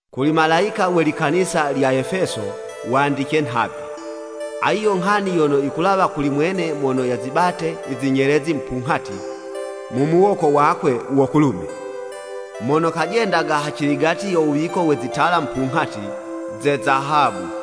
“Kuli malayika we likanisa lya Efeso, wandice nhavi, “ ‘Ayi yo nghani yono yikulawa kuli mwene mono yazibate i zinyelezi mupunghati mu muwoko wakwe wo kulume, mono kajendaga haciligati yo wuwiko we zitala mupunghati ze zahabu.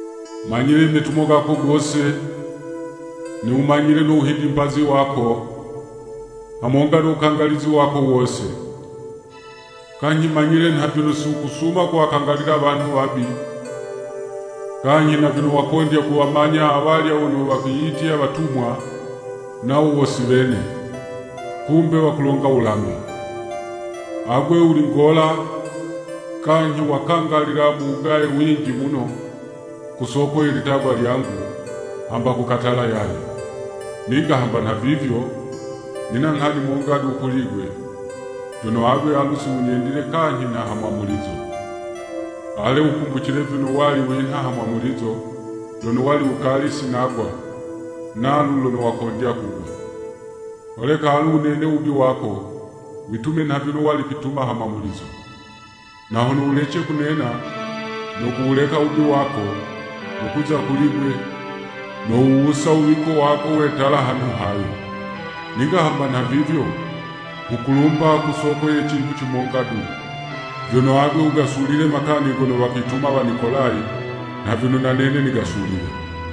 Manyile i metumo gako gose, niwumanyile no wuhidimbazi wako, hamonga no wukangalizi wako wose. Kanyhi manyile nha vyono si wukusuma kuwakangalila wanhu wabi, kanyhi na vyono wakondya kuwamanya awalya wono wakwiyitya watumwa, nawo wo si wene, kumbe wakulonga wulambi. Agwe wuli ngola, kanyhi wakangalila mu wugaye winji muno, ku soko ye litagwa lyangu, hamba kukatala yaye. Ninga hamba nhavivyo, nina nghani monga du kuli'gwe, vyono agwe alu si wunyendile kanyhi nha ha mwamulizo. Ale, wukumbucile vyono wali winha ha mwamulizo, lono wali wukali sinagwa, nalu lono wakondya kugwa! Holeka alu wunene wubi wako, witume nha vyono wali kwituma ha mwamulizo. Na hono wulece kunena no kuwuleka wubi wako, nokuza kuli'gwe, nowuwusa u wuwiko wako we tala hanhu hayo. Ninga hamba nhavivyo, nghukulumba ku soko ye cinhu cimonga du, vyono agwe wugasulile makani gono wakwituma Wanikolayi nha vyono na nene nigasulile.’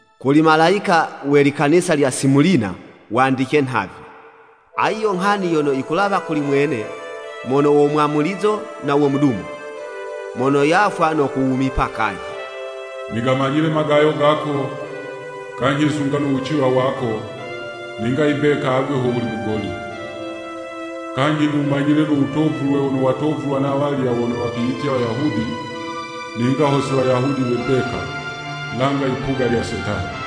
“Kuli malayika we likanisa lya Simulina, wandice nhavi, ‘Ayi yo nghani yono yikulawa kuli mwene mono wo Mwamulizo na wo Mudumo, mono yafwa no kuwumipa kanyhi. Nigamanyile magayo gako, kanyhi sunga no wuciwa wako, ninga imbeka agwe ho wuli mugoli. Kanyhi niwumanyile no wutovulwe wono watovulwa na walya wono wakwiyitya Wayahudi, ninga ho si Wayahudi we mbeka, langa yipuga lye Setani.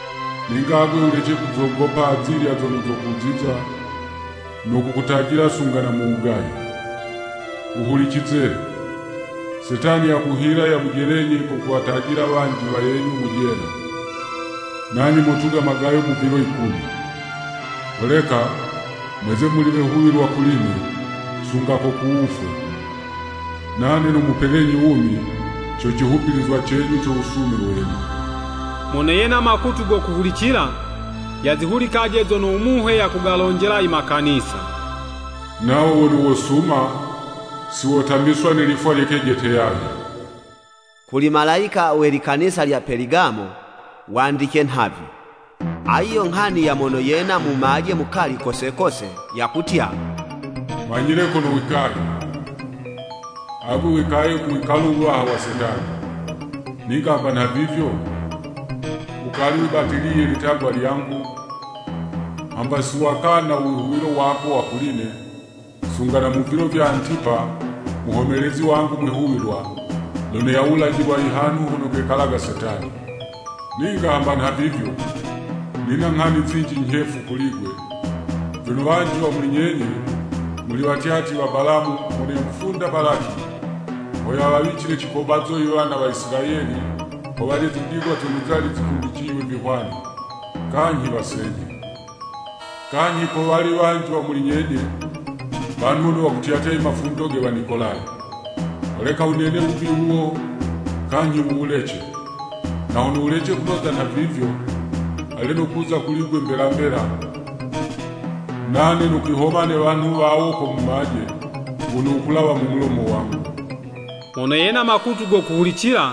Ninga agwe wulece kuzogopa azilya zono zokuziza no kukutajila sunga na mu wugaye. Wuhulicize! Setani yakuhila yamujelenyi ko kuwatajila wanji wayenyu mu jela, nanye motuga magayo mu vilo yikumi. Holeka, mweze muli wehuwilwa kuli'ne, sunga ko ku wufwe, nane nomupelenyi wumi, co cihumbilizwa cenyu co wusume wenyu.’ “Mono yena makutu go kuhulicila, yazihulikaje zono u Muhe yakugalonjela i makanisa! ‘Nawo wono wosuma, si wotamiswa ne lifwa lye kejete yaye.'" “Kuli malayika we likanisa lya Peligamo, wandice nhavi, ‘Ayi yo nghani ya mono yena mumaje mukali kose kose, yakutya, Manyile kono wikaye. Agwe wikaye ku wikalo wuwaha wa Setani! Ninga hamba nhavivyo, wukali wibatiliye litagwa lyangu, hamba si wakana u wihuwilo wako wa kuli'ne, sunga na mu vilo vya Antipa, muhomelezi wangu mwihuwilwa, lono yawulajilwa i hanhu hono kekalaga Setani. Ninga hamba nha vivyo, nina nghani zinji nyhefu kuli'gwe, vyono wanji wa muli nyenye, muli watyatyi wa Balamu mono yamufunda Balaki, ho yawawicile cikobazo i wana wa Isilayeli ho walye zindigwa zono zali zikumbiciywe vihwani, kanyhi wasenyhe. Kanyhi kowali wanji wa muli nyenye, wanhu wono wakutyatya i mafundo ge Wanikolayi. Holeka wunene wubi wuwo kanyhi wuwulece. Na hono wulece kunoza nhavivyo, ale nokuza kuli'gwe mbela mbela, nane nokwihoma ne wanhu wawo ko mumaje wono wukulawa mu mulomo wangu.’ “Mono yena makutu go kuhulicila,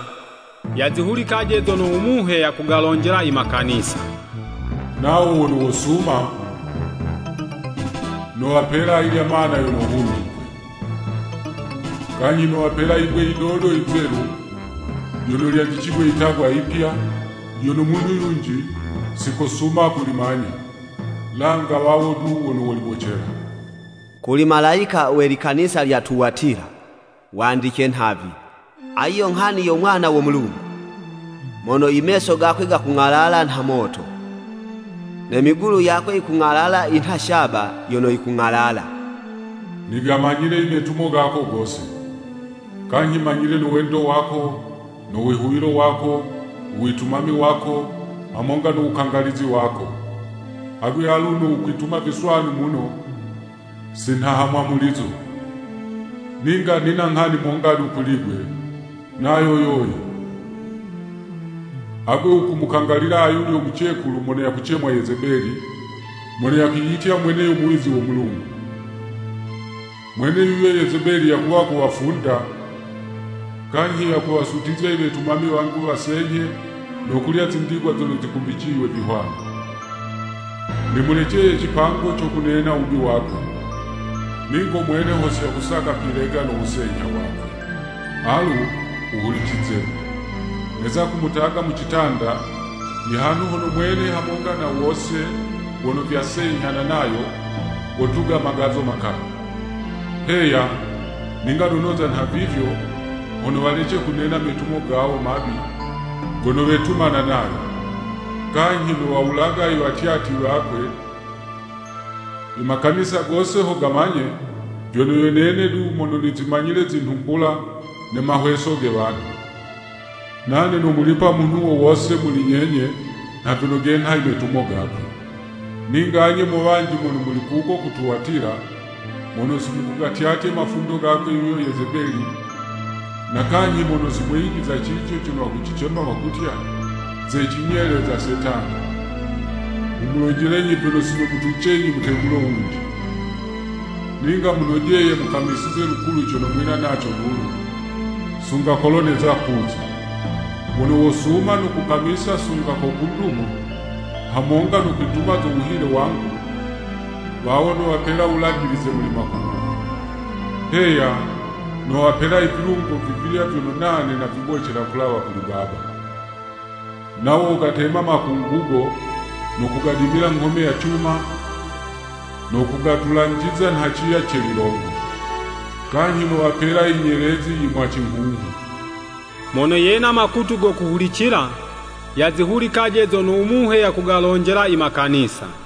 yazihulikaje zono u Muhe yakugalonjela i Makanisa! ‘Nawo wono wosuma, nowapela ayilya mana yono hundikwe. Kanyhi nowapela yibwe yidodo yizelu lyono lyandicigwe yitagwa yipya, lyono munhu yunji sikosuma kulimanya, langa wawo du wono wolibocela.'" “Kuli malayika we likanisa lya Tuwatila, wandice nhavi, ‘Ayi yo nghani yo Mwana wo Mulungu, mono i meso gakwe gakung'alala nha moto, ne migulu yakwe yikung'alala yinha shaba yono yikung'alala. Nigamanyile i metumo gako gose. Kanyhi manyile no wendo wako, no wihuwilo wako, u witumami wako, hamonga no wukangalizi wako. Agwe aluno wukwituma viswanu muno si nha hamwamulizo. Ninga nina nghani monga du kuli'gwe, nayo yoyi, Agwe wukumukangalila ayulyo mucekulu mono yakucemwa Yezebeli, mono yakwiyitya mwene yo muwizi wo Mulungu. Mwene yuyo Yezebeli yakuwa kuwafunda, kanyhi yakuwasutizya i wetumami wangu wasenyhe no kulya zindigwa zono zikumbiciywe vihwani. Nimuleceye cipango co kunena wubi wakwe, ningo mwene ho si yakusaka kwilega no wusenyha wakwe. Alu, wuhulicize! Neza kumutaga mu citanda, i hanhu hono mwene hamonga na wose wono vyasenyhana nayo, wotuga magazo makali. Heya, ninga nonoza nhavivyo, hono walece kunena metumo gawo mabi gono vyetumana nayo. Kanyhi nowawulaga i watyatyi wakwe, i makanisa gose ho gamanye vyono, yo nene du mono nizimanyile zinhumbula ne mahweso ge wanhu. Nane nomulipa munhu wo wose muli nyenye nha vyono genha i metumo gakwe.’ “Ninga anye mo wanji mono muli kuko ku Tuwatila, mono si mukugatyatye mafundo gakwe yuyo Yezebeli, na kanyhi mono si mweyijiza cico cono wakucicema wakutya, ‘Ze cinyele za Setani,’ nghumulonjelenyi vyono si nomutwicenyi mutegulo wunji. Ninga munojeye mukamisize lukulu cono mwina naco lulu, sunga kolo neza kuza. “Wono wosuma no kukamisa sunga ko ku ndumo, hamonga no kwituma zo wuhile wangu, wawo nowapela wulajilize muli makungugo. Heya, nowapela i vilungo vivilya vyono nane navibocela kulawa kuli Baba. Nawo wogatema makungugo no kugadimila nghome ya cuma, no kugatulanjiza nha ciya ce lilongo. Kanyhi nowapela i nyelezi yi mwacinghunghu. Mono yena makutu go kuhulicila, yazihulikaje zono u Muhe yakugalonjela i makanisa!”